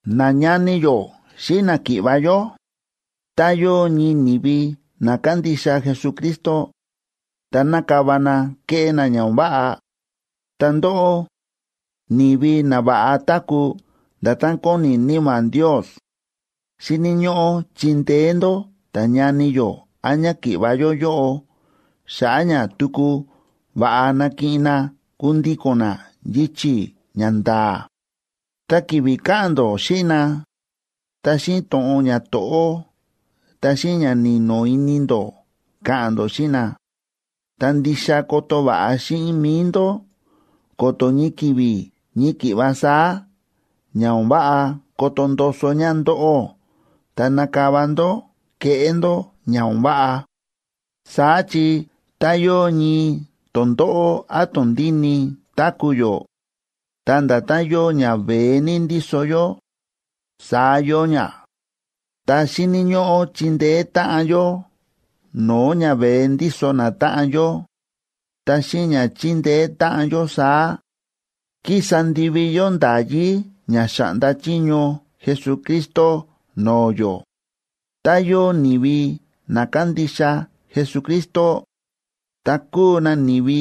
Nañani yó xíꞌin náki̱ꞌva̱ yó, tá yóo ñii ni̱vi na kándixa Jesucristo ta na̱kava na ke̱ꞌé na ña o̱n váꞌa, ta ndóꞌó, ni̱vi na va̱ꞌa táku̱ nda̱tán kóni Níma̱ Ndios, xíni̱ ñóꞌó chindeé ndó ta̱ñani yó án ñáki̱ꞌva̱ yó yóꞌo xa̱ꞌa̱ ña tuku va̱ꞌa nakiꞌin na kundíko̱n na yichi̱ ña nda̱a̱. Ta ki̱vi̱ ka̱ꞌa̱n ndó xíꞌin na, ta xíꞌin to̱ꞌon ñato̱ꞌó ta xíꞌin ña ni̱no̱ ini ndó ka̱ꞌa̱n ndó xíꞌin na. Ta ndixa koto va̱ꞌa xíꞌin mi̱i ndó ko̱to̱ ñii ki̱vi̱ ñii ki̱ꞌva saá ña o̱n váꞌa koto ndoso ña ndóꞌó ta nakava ndó keꞌé ndó ña o̱n váꞌa. Saá chi tá yóo ñii tondóꞌó án tondíni táku̱ yó, ta nda̱tán yóo ñaveé ní ndíso yó, saá yóo ña, ta xíni̱ ñóꞌó chindeé táꞌan yó no̱o̱ ñaveé ndíso natáꞌan yó. Ta xíꞌin ña chíndeé táꞌan yó saá, kísa ndivi yó nda̱yí ña xa̱ꞌnda chiño Jesucristo no̱o̱ yó. Tá yóo ni̱vi na kándixa Jesucristo, ta kúu na ni̱vi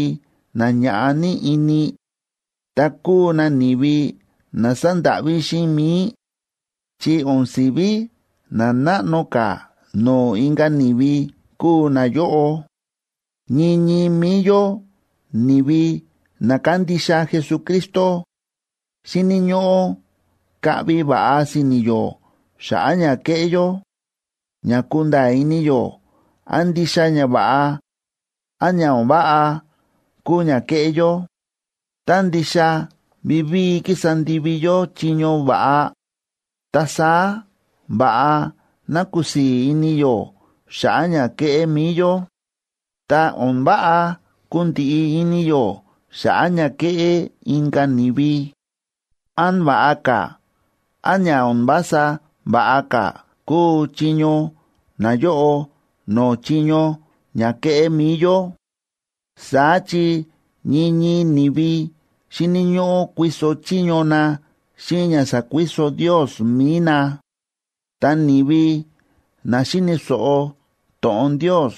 na ñaꞌá ní ini, ta kúu na ni̱vi na sándáꞌví xíꞌin mi̱i, chi o̱n si̱ví na náꞌno ka̱ no̱o̱ inka̱ ni̱vi kúu nayóꞌo. Ñii ñii mi̱i yó ni̱vi na kándixa Jesucristo, xíni̱ ñóꞌó kaꞌvi va̱ꞌa si̱ni̱ yó xa̱ꞌa̱ ña kéꞌé yó, ña kunda̱a̱ ini yó án ndixa ñava̱ꞌa, án ña o̱n váꞌa kúu ña kéꞌé yó. Tá ndixa vivíi kísa ndivi yó chiño va̱ꞌa, ta saá va̱ꞌa ná kusii̱ ini yó xa̱ꞌa̱ ña kéꞌé mi̱i yó. Ta o̱n váꞌa kundiꞌi ini yó xa̱ꞌa̱ ña kéꞌé inka̱ ni̱vi, án va̱ꞌa ka̱ án ña o̱n vása va̱ꞌa ka̱ kúu chiño nayóꞌo no̱o̱ chiño ña kéꞌé mi̱i yó. Saá chi ñii ñii ni̱vi xíni̱ ñóꞌó kuiso chiño na xíꞌin ña sa̱kuiso Ndios mi̱i na. Ta ni̱vi na xíni̱ so̱ꞌo to̱ꞌon Ndios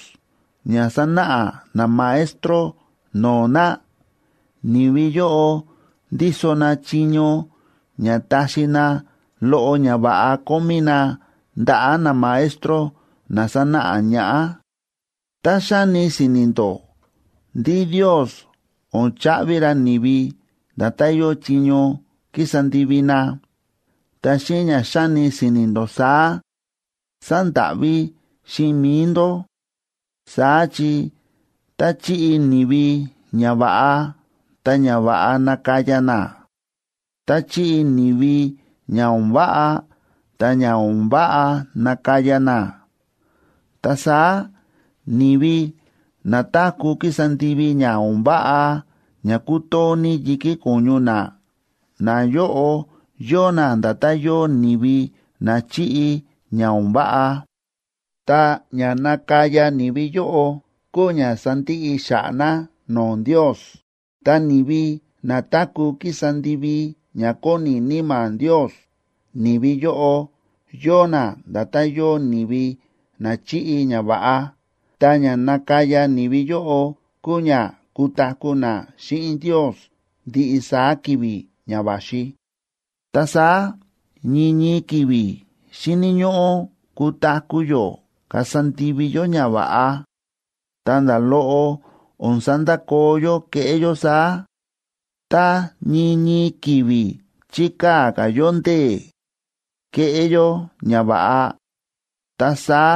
ña sánáꞌa namaestro no̱o̱ na, ni̱vi yóꞌo ndíso na chiño ña taxi na loꞌo ñava̱ꞌa kómí na ndaꞌa̱ namaestro na sánáꞌa ñaꞌá. Tá xáni si̱ni̱ ndó ndí Ndios o̱n chaꞌvi ra ni̱vi nda̱tán yóo chiño kísa ndivi na, ta xíꞌin ña xáni si̱ni̱ ndó saá, sándáꞌví xíꞌin mi̱i ndó. Saá chi tá chiꞌi ni̱vi ñava̱ꞌa, ta ñava̱ꞌa nakaya na. Tá chiꞌi ni̱vi ña o̱n váꞌa, ta ña o̱n váꞌa nakaya na. Ta saá ni̱vi na táku̱ kísa ndivi ña o̱n váꞌa ña kútoo ní yi̱kí ko̱ñu na, nayóꞌo yóo na nda̱tán yóo ni̱vi na chi̱ꞌi ña o̱n váꞌa, ta ña nakaya ni̱vi yóꞌo kúu ña sandiꞌi xa̱ꞌa̱ na no̱o̱ Ndios. Ta ni̱vi na táku̱ kísa ndivi ña kóni Níma̱ Ndios, ni̱vi yóꞌo yóo na nda̱tán yóo ni̱vi na chi̱ꞌi ñava̱ꞌa, ta ña nakaya ni̱vi yóꞌo kúu ña kutaku̱ na xíꞌin Ndios ndiꞌi saá ki̱vi̱ ña va̱xi. Ta saá ñii ñii ki̱vi̱ xíni̱ ñóꞌó kutaku̱ yó kasa ndivi yó ñava̱ꞌa, ta nda̱ loꞌo o̱n sandakoo yó kéꞌé yó saá. Tá ñii ñii ki̱vi̱ chikaa̱ ka̱ yó ndee̱ keꞌé yó ñava̱ꞌa, ta saá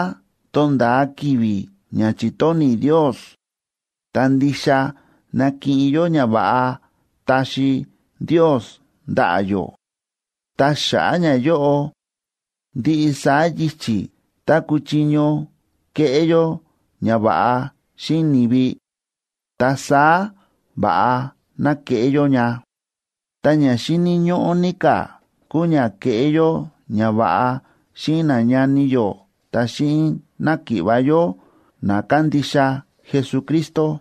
tonda̱a ki̱vi̱ ña chi̱tóni̱ Ndios, ta ndixa nakiꞌin yó ñava̱ꞌa taxi Ndios ndaꞌa̱ yó. Ta xa̱ꞌa̱ ñayóꞌo, ndiꞌi saá yichi̱ tá kuchiño keꞌé yó ñava̱ꞌa xíꞌin ni̱vi, ta saá va̱ꞌa ná keꞌé yó ña. Ta ña xíni̱ ñóꞌó ní ka̱ kúu ña keꞌé yó ñava̱ꞌa xíꞌin nañani yó ta xíꞌin náki̱ꞌva̱ yó na kándixa Jesucristo.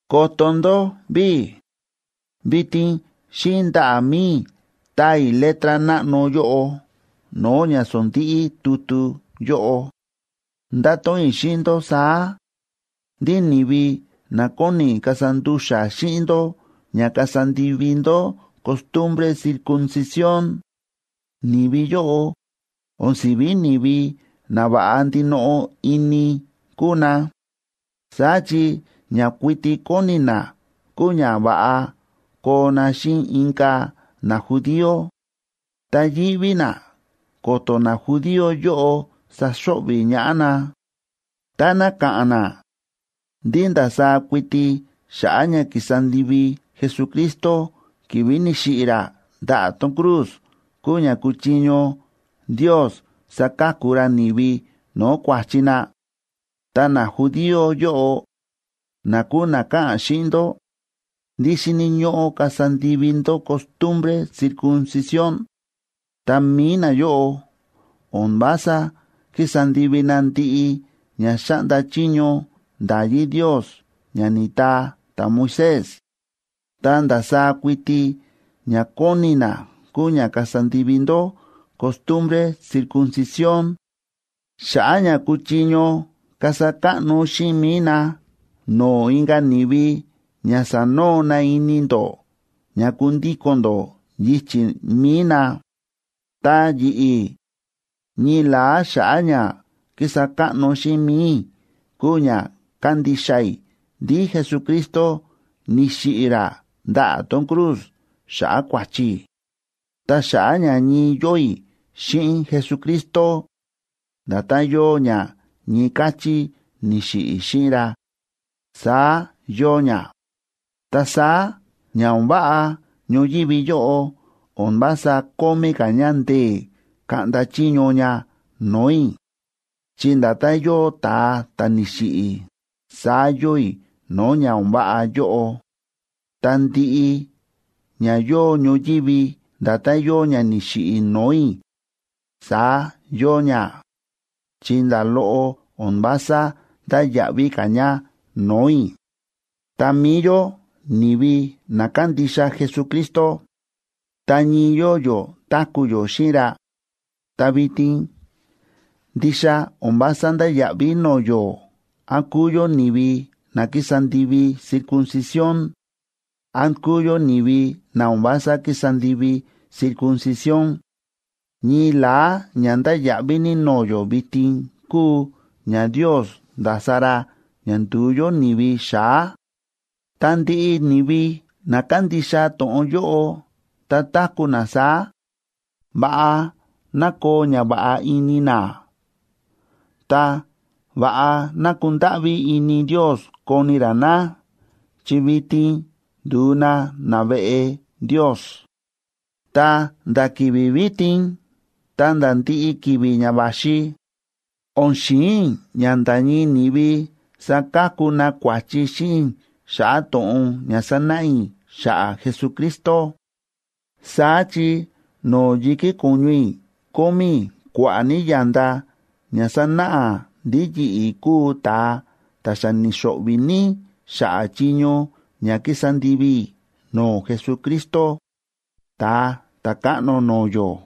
Koto ndó ví, vitin xíꞌin ndaꞌa̱ mi̱i i̱ táa i̱ letra náꞌno yóꞌo no̱o̱ ña sondíꞌí tutu yóꞌo. Ndáto̱ꞌon i̱ xíꞌin ndó saá, ndí ni̱vi na kóni kasa ndu̱xa̱ xíꞌin ndó ña kasa ndivi ndó costumbre circuncisión, ni̱vi yóꞌo o̱n si̱ví ni̱vi na va̱ꞌa ndinoꞌo ini kúu na. Saá chi ña kuiti kóni na kúu ña va̱ꞌa koo na xíꞌin inka̱ najudío, ta yíꞌví na ko̱to̱ najudío yóꞌo saxo̱ꞌvi̱ ñaꞌá na, táná ka̱ꞌa̱n na ndí ndasaá kuiti xa̱ꞌa̱ ña ki̱sa ndivi Jesucristo ki̱vi̱ ni̱xiꞌi̱ ra ndaꞌa̱ tón cruz kúu ña kuchiño Ndios saka̱ku ra ni̱vi no̱o̱ kua̱chi na. Ta najudío yóꞌo, na kúu na káꞌa̱n xíꞌin ndó ndí xíni̱ ñóꞌó kasa ndivi ndó costumbre circuncisión, ta mi̱i nayóꞌo o̱n vása kísa ndivi na ndiꞌi ña xáꞌnda chiño nda̱yí Ndios ña ni̱taa ta̱Moisés. Ta ndasaá kuiti ña kóni na kúu ña kasa ndivi ndó costumbre circuncisión, xa̱ꞌa̱ ña kuchiño kasa káꞌno xíꞌin mi̱i na no̱o̱ inka̱ ni̱vi ña sanoo na ini ndó ña kundíko̱n ndó yichi̱ mi̱i na. Ta yi̱ꞌi̱, ñii la̱á xa̱ꞌa̱ ña kísa káꞌno xíꞌin mi̱i i̱ kúu ña kándixa i̱ ndí Jesucristo ni̱xiꞌi̱ ra ndaꞌa̱ tón cruz xa̱ꞌa̱ kua̱chi i̱. Ta xa̱ꞌa̱ ña ñii yóo i̱ xíꞌin Jesucristo, nda̱tán yóo ña ñii káchí ni̱xiꞌi̱ i̱ xíꞌin ra, saá yóo ña. Ta saá ña o̱n váꞌa ñoyívi yóꞌo o̱n vása kómí ka̱ ña ndee̱ kaꞌnda chiño ña no̱o̱ i̱, chi nda̱tán yóo ta̱a ta̱ ni̱xiꞌi̱, saá yóo i̱ no̱o̱ ña o̱n váꞌa yóꞌo. Ta ndiꞌi ña yóo ñoyívi nda̱tán yóo ña ni̱xiꞌi̱ no̱o̱ i̱, saá yóo ña, chi nda̱ loꞌo o̱n vása ndáya̱ꞌví ka̱ ña no̱o̱ i̱. Ta mi̱i yó ni̱vi na kándixa Jesucristo ta ñii yóo yó táku̱ yó xíꞌin ra, ta vitin ndixa o̱n vása ndáya̱ꞌví no̱o̱ yó án kúu yó ni̱vi na kísa ndivi circuncisión, án kúu yó ni̱vi na o̱n vása kísa ndivi circuncisión. Ñii la̱á ña ndáya̱ꞌví ní no̱o̱ yó vitin kúu ña Ndios nda̱sa ra ña ndu̱u yó ni̱vi xa̱á. Ta ndiꞌi ni̱vi na kándixa to̱ꞌon yóꞌo ta táku̱ na saá, ¡va̱ꞌa ná koo ñava̱ꞌa ini na! Ta, ¡va̱ꞌa ná kundáꞌví ini Ndios koni ra na! Chi vitin ndu̱u na naveꞌe Ndios. Ta nda̱ ki̱vi̱ vitin ta̱nda̱ ndiꞌi ki̱vi̱ ña va̱xi, o̱n xi̱in i̱ ña nda̱ ñii ni̱vi sakaku na kua̱chi xíꞌin i̱ xa̱ꞌa̱ to̱ꞌon ña sánáꞌa i̱ xa̱ꞌa̱ Jesucristo. Saá chi no̱o̱ yi̱kí ko̱ñu i̱ kómí i̱ kua̱ꞌa̱ ní ya̱nda ña sánáꞌa ndí yi̱ꞌi̱ kúu ta̱a ta̱ xa ni̱xo̱ꞌvi̱ ní xa̱ꞌa̱ chiño ña ki̱sa ndivi i̱ no̱o̱ Jesucristo, Ta̱a Ta̱káꞌno no̱o̱ yó.